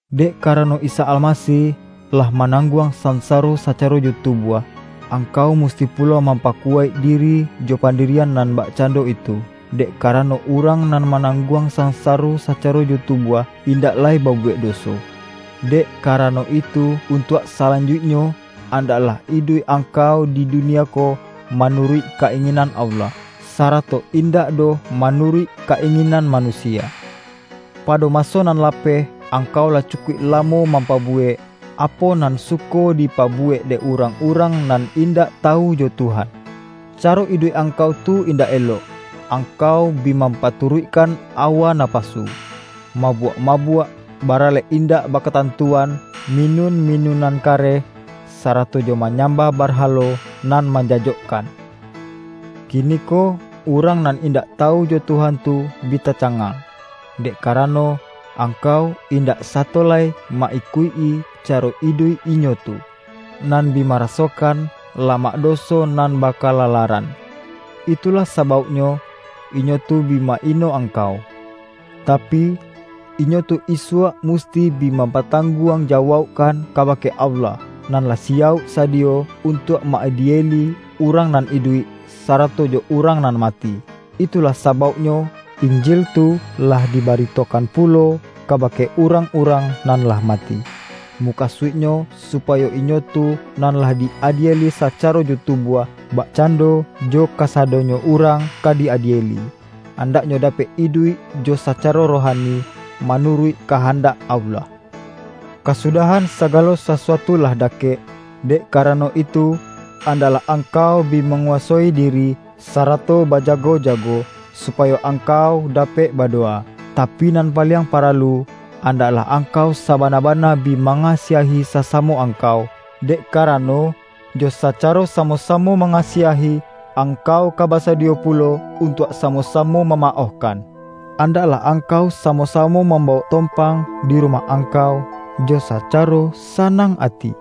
Dek karano Isa Almasih lah ma-nangguang sansaro sacaro jo tu-buah, angkau musti pulo mampaku-waik diri jo pandirian nan bakcando itu. Dek karano, urang nan manang-guang sansaro sacaro jo tubuah, in-dak lai babuwek doso. Dek karano itu, untuak salanjuiknyo, andaklah iduik angkau di dunia ko manuruik ka-inginan Allah, sarato indak doh manuruik ka-inginan manusia. Pado maso nan lapeh, angkau lah cukuik lamo mampabuwek, apo nan suko di-pabuwek dek urang-urang nan indak tawu jo Tuhan. Caro iduik angkau tu indak elok. Angkau bi mampaturuik-kan awa napasu, mabuak-mabuak, baralek indak bakatantuan, minun-minunan kareh, sarato jo manyam-bah barhalo nan manjajokkan. Kini-ko urang nan indak tawu jo Tuhan tu bi tacangang, dek karano, angkau in-dak sato lai ma-ikuik-i caro iduik inyo tu, nan bi marasokan lamak doso nan bakalalaran. Itulah sabauknyo, inyo tu bi ma-ino angkau. Tapi, inyo tu isuak musti bi mampatangguang jawaukkan kabake Allah, nan lah si-yauk sadiyo untuak ma-adieli urang nan iduik, sarato jo urang nan mati. Itulah sabauknyo, Injil tu lah diba-ritokan pulo kabake urang-urang nan lah mati. Mukasuiknyo supayo inyo tu, nan lah di-adieli sacaro jo tubuah — bakcando jo kasadonyo urang ka di-adieli — andaknyo dapek iduik jo sacaro rohani, manuruik kahandak Allah. Kasudahan sagalo sasuatu lah da-kek, dek karano itu, andaklah angkau bi manguwasoi diri, sarato bajago-ja-go, supayo angkau dapek badowa. Tapi nan paliang paralu, andaklah angkau sabana-bana bi mangasiahi sasamo angkau, dek karano, jo saca-ro samo-samo mangasiahi, angkau ka basadiyo pulo untuak samo-samo ma-maohkan. Andaklah angkau samo-samo mambawok tompang di rumah angkau, jo sacaro sanang ati.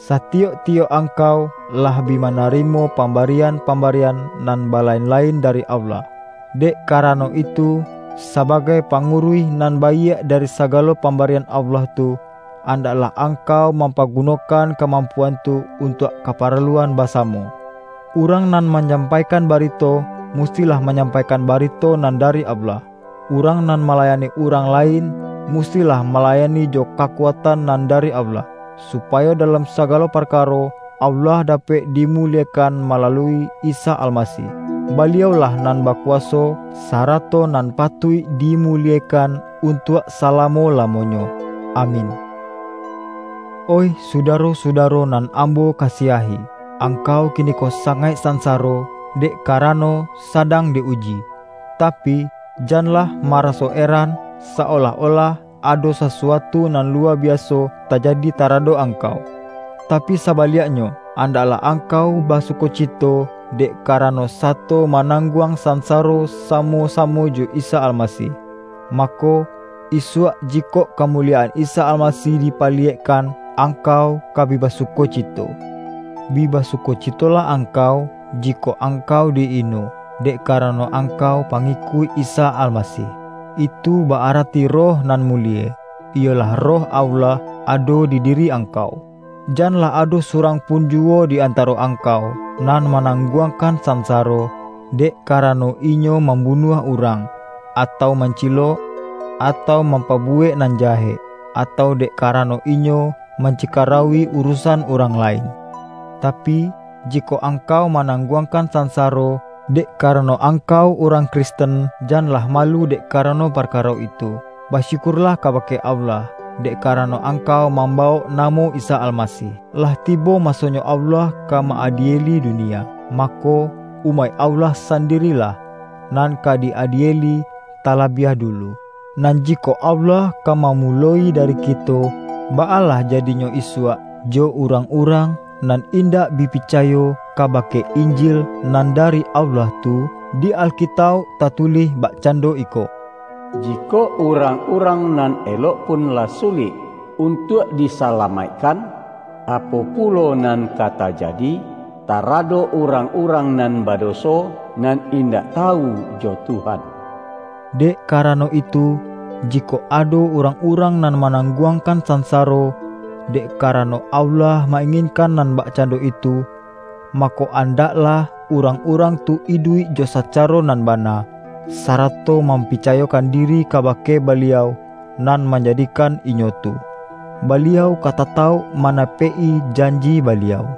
Sati-yok-tiyok angkau, lah bi manarimo pambarian-pambarian nan balain-la-in dari Allah. Dek karano itu, saba-gai panguruih nan baiak dari sagalo pambarian Allah tu, andaklah ang-kau mampagunokan kamampuan tu untuak kaparaluan basamo. Urang nan manyampaikan barito, mustilah manyampaikan barito nan dari Allah; urang nan malayani urang lain, mus-tilah malayani jo kakuatan nan dari Allah, supayo dalam sagalo parkaro, Allah dapek dimuliekan malalui Isa Almasih. Baliau-lah nan bakuwaso, sarato nan patuik dimuliekan untuak salamo-lamonyo. Amin! Oih sudaro-sudaro nan ambo ka-siahi! Angkau kiniko sangaik sansaro, dek karano sadang di-uji. Tapi, jan-lah maraso eran, sa-olah-olah ado sasuatu nan luwa biaso tajadi taradok angkau. Tapi sabaliaknyo, andak-lah angkau basukocito, dek karano, sato manangguang sansaro samo-sa-mo jo Isa Almasih. Mako, isuak jikok kamuliyaan Isa Almasih dipaliyek-kan, angkau ka bi basukocito. Bi basukocitolah angkau, jikok angkau di-ino, dek karano angkau pangikuik Isa Almasih. Itu ba-arati Roh nan mulie, iyolah Roh Allah, ado di di-ri angkau. Janlah ado surang pun juwo di antaro angkau, nan manang-guangkan sansaro, dek karano inyo mambunuah urang, atau mancilok, atau mampabuwek nan jahek, atau dek karano inyo mancikarauwi uru-san urang lain. Tapi, jikok angkau manangguangkan sansaro, dek kara-no angkau urang Kristen, janlah ma-lu dek karano parkaro itu. Basyukur-lah kabake Allah, dek karano angkau mambawok namo Isa Almasih. Lah tibo masonyo Allah ka ma-adieli dunia. Mako, umaik Allah san-dirilah, nan ka di-adieli talabiah du-lu. Nan jikok Allah ka mamuloi dari kito, baa lah jadinyo isuak, jo urang-urang nan indak bi picayo kabake In-jil nan dari Allah tu? Di Alkitauk ta-tulih bakcando iko,”Jikok urang-urang nan elok pun lah sulik untuak disalamaikkan, apo pulo nan ka tajadi, taradok urang-urang nan badoso, nan indak tawu jo Tuhan!” Dek karano itu, jikok ado urang-urang nan manangguangkan sansaro, dek karano Allah ma-inginkan nan bakcando itu, mako, andaklah urang-urang tu iduik jo sacaro nan bana, sarato mampicayokan diri kabake Ba-liau Nan Manjadikan inyo tu. Baliau ka tatauk manapek-i janji Baliau.